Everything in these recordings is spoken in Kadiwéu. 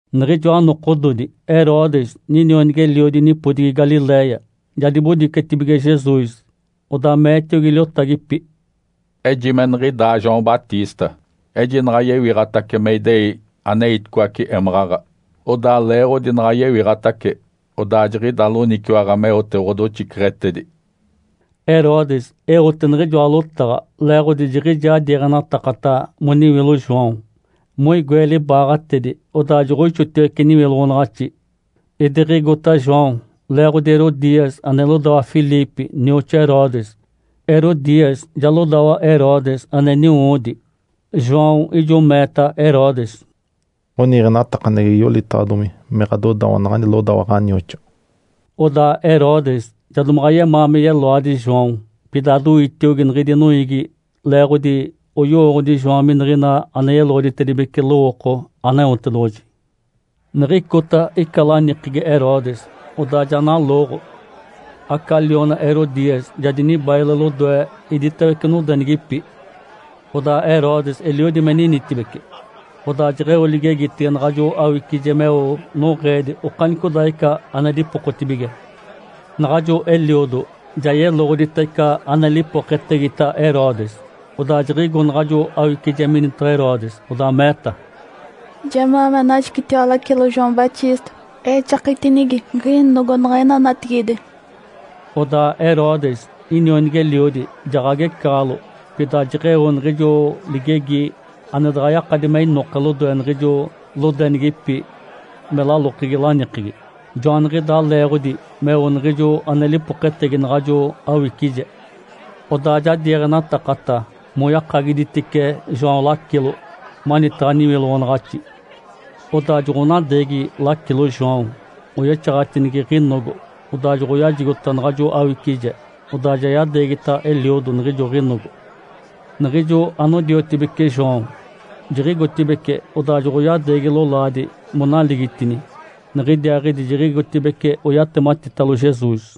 Niɡ̶ijoa nokododi Herodes, ninionigi-eliodi nipodigi Galiléia, ja dibodicetibige Jesus. Odaa meetiogi liotagipi, “Ejime niɡ̶idaa João Batista, ejinaɡ̶a yewiɡ̶atace me idei aneiticoace émaɡ̶aɡ̶a. Odaa leeɡ̶odi naɡ̶a yewiɡ̶atace, odaa jiɡ̶ida loniciwaɡ̶a meote ɡ̶odoxiceɡ̶etedi.” Herodes eote niɡ̶ijoa lotaɡ̶a leeɡ̶odi jiɡ̶ijaa diiɡ̶enatakata moniwilo João, moigoe libaaɡ̶atedi, odaa joɡ̶oixotiwece niwiloɡ̶onaɡ̶axi. Idiɡ̶igota João leeɡ̶ote Herodias ane lodawa Filipe nioxoa Herodes. (Herodias ja lodawa Herodes ane niniwoodi.) João ijo meeta Herodes, “Ǥoniiɡ̶enatakaneɡ̶egi yolitaɡ̶adomi me ɡ̶adodawa naɡ̶ani lodawa ɡ̶anioxoa.” Odaa Herodes ja domaɡ̶a yemaa me yeloadi João, pida doitiogi niɡ̶idi noiigi, leeɡ̶odi oyowooɡ̶odi João miniɡ̶ina ane yeloɡ̶oditedibece lowooko Aneotedoɡ̶oji. Niɡ̶icota ica lanikegi Herodes, odaa ja nalooɡ̶o. Aca liona Herodias ja dinibaile lodoe iditawece nodenigipi, odaa Herodes eliodi me ninitibece. Odaa jeɡ̶eo ligegitege naɡ̶ajo awicije meo noɡ̶eedi okanicodaaɡ̶ica ane dipokotibige. Naɡ̶ajo eliodo ja yeloɡ̶odita ica ane lipoketegita Herodes. Odaa jiɡ̶igo naɡ̶ajo awicije minitaɡ̶a Herodes, odaa meeta, “Jemaa me anajicitiwa lacilo João Batista exakitinigi ɡ̶inogo niɡ̶ina natigide.” Odaa Herodes, inionigi-eliodi, jaɡ̶agecaɡ̶alo. Pida jeɡ̶eo niɡ̶ijo ligegi ane daɡ̶a yakadi me inoke lodoe niɡ̶ijo lodenigipi me lalokegi lanikegi. Joaniɡ̶idaa leeɡ̶odi meo niɡ̶ijo ane lipoketegi naɡ̶ajo awicije. Odaa ja diiɡ̶enatakata moyakagiditice João lacilo manitaɡ̶a niwiloɡ̶onaɡ̶axi. Odaa joɡ̶onadeegi lacilo João oyexaɡ̶atinigi ɡ̶inogo, odaa joɡ̶oyajigota naɡ̶ajo awicije, odaa ja yadeegita eliodo niɡ̶ijo ɡ̶inogo. Niɡ̶ijo anodiotibeci João jiɡ̶igotibeci, odaa joɡ̶oyadeegi lolaadi monaligitini. Niɡ̶idiaaɡ̶idi jiɡ̶igotibeci oyatematitalo Jesus.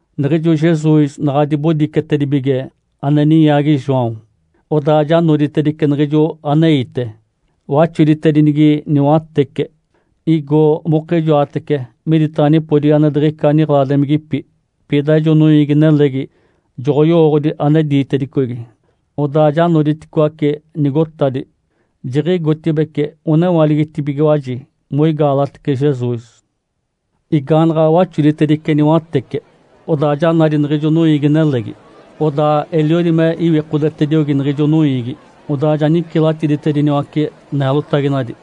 Niɡ̶ijo Jesus naɡ̶a dibodicetedibige ane ninyaagi João, odaa ja noditedice niɡ̶ijo aneite, waxoditedinigi niwatece, igo mokijoatece miditaɡ̶a nipodigi ane diɡ̶ica niɡ̶eladimigipi. Pida ijo noiigi-nelegi joɡ̶oyowooɡ̶odi ane diitedicogi, odaa ja noditicoaci nigotadi, jiɡ̶igotibeci onewaligitibigiwaji moigaalatece Jesus. Igaanaɡ̶a waxoditedice niwatece, odaa ja nadi niɡ̶ijo noiigi-nelegi. Odaa eliodi me iwikodetediogi niɡ̶ijo noiigi, odaa ja nicilatiditediniwace neelotaginadi.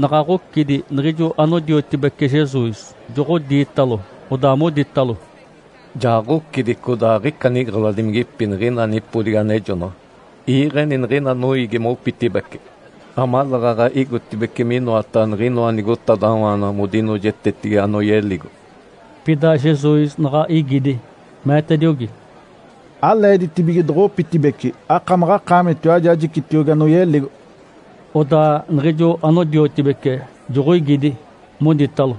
Naɡ̶a ɡ̶ocidi, niɡ̶ijo anodiotibece Jesus joɡ̶odiitalo, odaa moditalo, “Ja ɡ̶ocidi, codaa aɡ̶ica niɡ̶eladimigipi niɡ̶ina nipodigi anejonaɡ̶a. Iiɡ̶eni niɡ̶ina noiigi mopitibeci, amaleeɡ̶aɡ̶a igotibeci minoataɡ̶a niɡ̶inoa nigotadawaanaɡ̶a modinoojetetigi anoyeligo.” Pida Jesus naɡ̶a igidi, meetediogi, “Aleeditibige doɡ̶opitibeci. Akamaɡ̶akaamitiwaji ajicitiogi anoyeligo!” Odaa niɡ̶ijo anodiotibece joɡ̶oigidi, moditalo,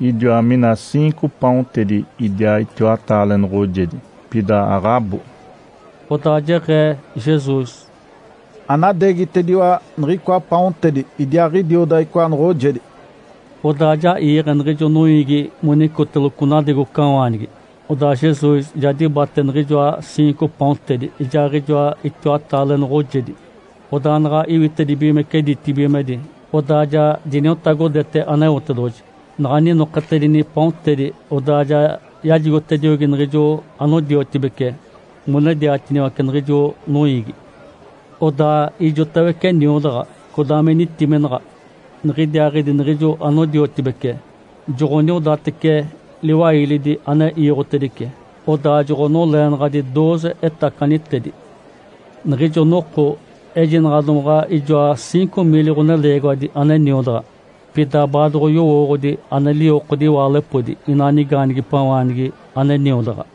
“Idiwa mina ciinco paontedi, idiaa itiwataale noɡ̶ojedi, pida aɡ̶abo!” Odaa jeɡ̶ee Jesus, “Anadeegitediwa niɡ̶icoa paontedi idiaaɡ̶idioda icoa noɡ̶ojedi!” Odaa ja iiɡ̶e niɡ̶ijo noiigi monicoteloco nadegocawaanigi. Odaa Jesus ja dibate niɡ̶ijoa ciinco paontedi ijaaɡ̶ijoa itiwataale noɡ̶ojedi. Odaa naɡ̶a iwitedibigimece ditibigimedi, odaa ja diniotagodete Aneotedoɡ̶oji. Naɡ̶a ninoketedini paontedi, odaa ja yajigotediogi niɡ̶ijo anodiotibece monediatiniwace niɡ̶ijo noiigi. Odaa ijotawece niodaɡ̶a, codaa me nitiminaɡ̶a. Niɡ̶idiaaɡ̶idi niɡ̶ijo anodiotibece joɡ̶oniodatece liwailidi ane iiɡ̶otedice. Odaa joɡ̶onoleenaɡ̶adi dooze etacanitedi. Niɡ̶ijo noko ejinaɡ̶a domaɡ̶a ijoa ciinco miili ɡ̶oneleegiwadi ane niodaɡ̶a, pida baadoɡ̶oyowooɡ̶odi ane liwokodi iwaalepodi inaa nigaanigipawaanigi ane niodaɡ̶a.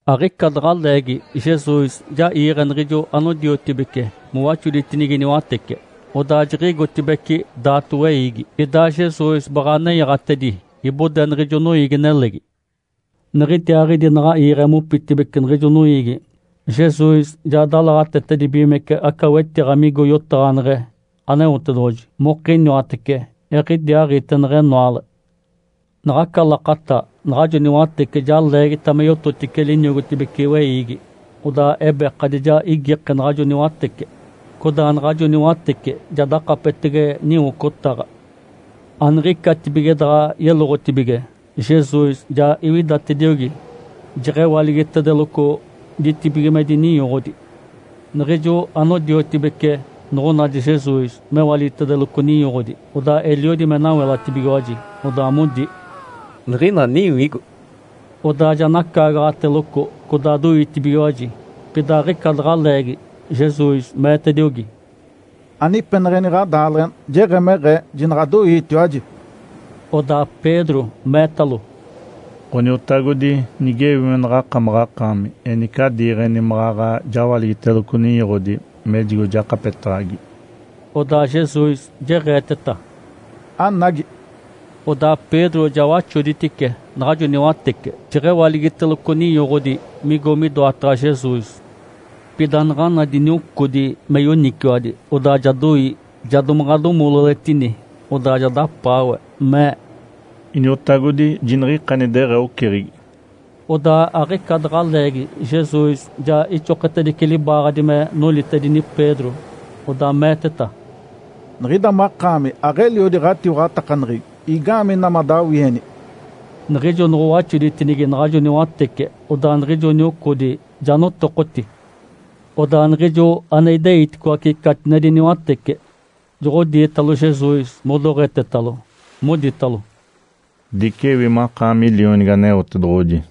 Aɡ̶ica daɡ̶a leegi Jesus ja iiɡ̶e niɡ̶ijo anodiotibece mowaxoditinigi niwatece, odaa jiɡ̶igotibeci daato weiigi, idaa Jesus baɡ̶a nenyaɡ̶atedi ibode niɡ̶ijo noiigi-nelegi. Niɡ̶idiaaɡ̶idi naɡ̶a iiɡ̶e mopitibeci niɡ̶ijo noiigi, Jesus ja dalaɡ̶atetedibigimece aca wetiɡ̶a migo yotaɡ̶aneɡ̶e Aneotedoɡ̶oji mokiniwatece. Eɡ̶idiaaɡ̶ite neɡ̶enoale. Naɡ̶aca lakata naɡ̶ajo niwatece ja leegita me yototice liniogotibece weiigi. Odaa ebekadi ja igike naɡ̶ajo niwatece, codaa naɡ̶ajo niwatece ja dakapetege niwocotaɡ̶a. Aniɡ̶icatibige daɡ̶a yeloɡ̶otibige, Jesus ja iwidatediogi, jeɡ̶ewaligitedeloco ditibigimedi ninyoɡ̶odi. Niɡ̶ijo anodiotibece noɡ̶onadi Jesus mewaligitedeloco ninyoɡ̶odi, odaa eliodi me nawelatibigiwaji, odaa modi, “Niɡ̶ina niwigo!”. Odaa ja nacaagaɡ̶ateloco codaa doitibigiwaji. Pida aɡ̶ica daɡ̶a leegi Jesus meetediogi, “Anipeneɡ̶eni ɡ̶adaaleɡ̶ena! Jeɡ̶emeɡ̶ee. Jinaɡ̶adoiitiwaji!” Odaa Pedro meetalo, “Ǥoniotagodi, nigewi naɡ̶akamaɡ̶akaami, enice adiiɡ̶eni maɡ̶aɡ̶a jawaligiteloco ninyoɡ̶odi mejigo jakapetaɡ̶agi.” Odaa Jesus jeɡ̶eeteta, “Anagi!” Odaa Pedro ja waxoditice naɡ̶ajo niwatece, jeɡ̶ewaligiteloco ninyoɡ̶odi migo midoataɡ̶a Jesus. Pida naɡ̶a nadi niocodi me yoniciwadi, odaa ja doi, ja domaɡ̶a domololetini. Odaa ja dapaawe, mee, “Iniotagodi, jiniɡ̶ikani deɡ̶ee oceɡ̶egi!” Odaa aɡ̶ica daɡ̶a leegi Jesus ja ixoketedice libaaɡ̶adi me nolitedini Pedro, odaa meeteta, “Niɡ̶ida makaami aɡ̶eliodi ɡ̶atiwaɡ̶atakaneɡ̶egi! Igaamee ina madawieni?” Niɡ̶ijo noɡ̶owaxoditinigi naɡ̶ajo niwatece, odaa niɡ̶ijo niocodi ja notokoti. Odaa niɡ̶ijo ane ideiticoace catinedi niwatece, joɡ̶odiitalo Jesus modoɡ̶etetalo, moditalo, “Dicewi makaami Lionigi Aneotedoɡ̶oji!”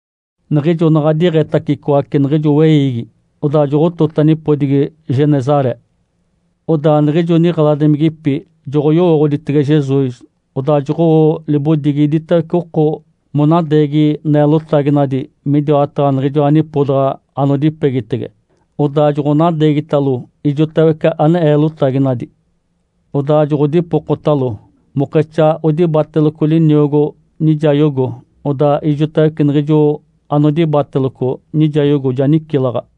Niɡ̶ijo naɡ̶a diɡ̶etacicoace niɡ̶ijo weiigi, odaa joɡ̶otota nipodigi Genesaré. Odaa niɡ̶ijo niɡ̶eladimigipi joɡ̶oyowooɡ̶oditege Jesus, odaa joɡ̶owo libodigi iditawece oko monadeegi neelotaginadi midiwataɡ̶a niɡ̶ijoa nipodaɡ̶a anodipegitege. Odaa joɡ̶onadeegitalo ijotawece ane eelotaginadi. Odaa joɡ̶odipokotalo mokexaa odibateloco liniogo nijayogo. Odaa ijotawece niɡ̶ijo anodibateloco nijayogo ja nicilaɡ̶a.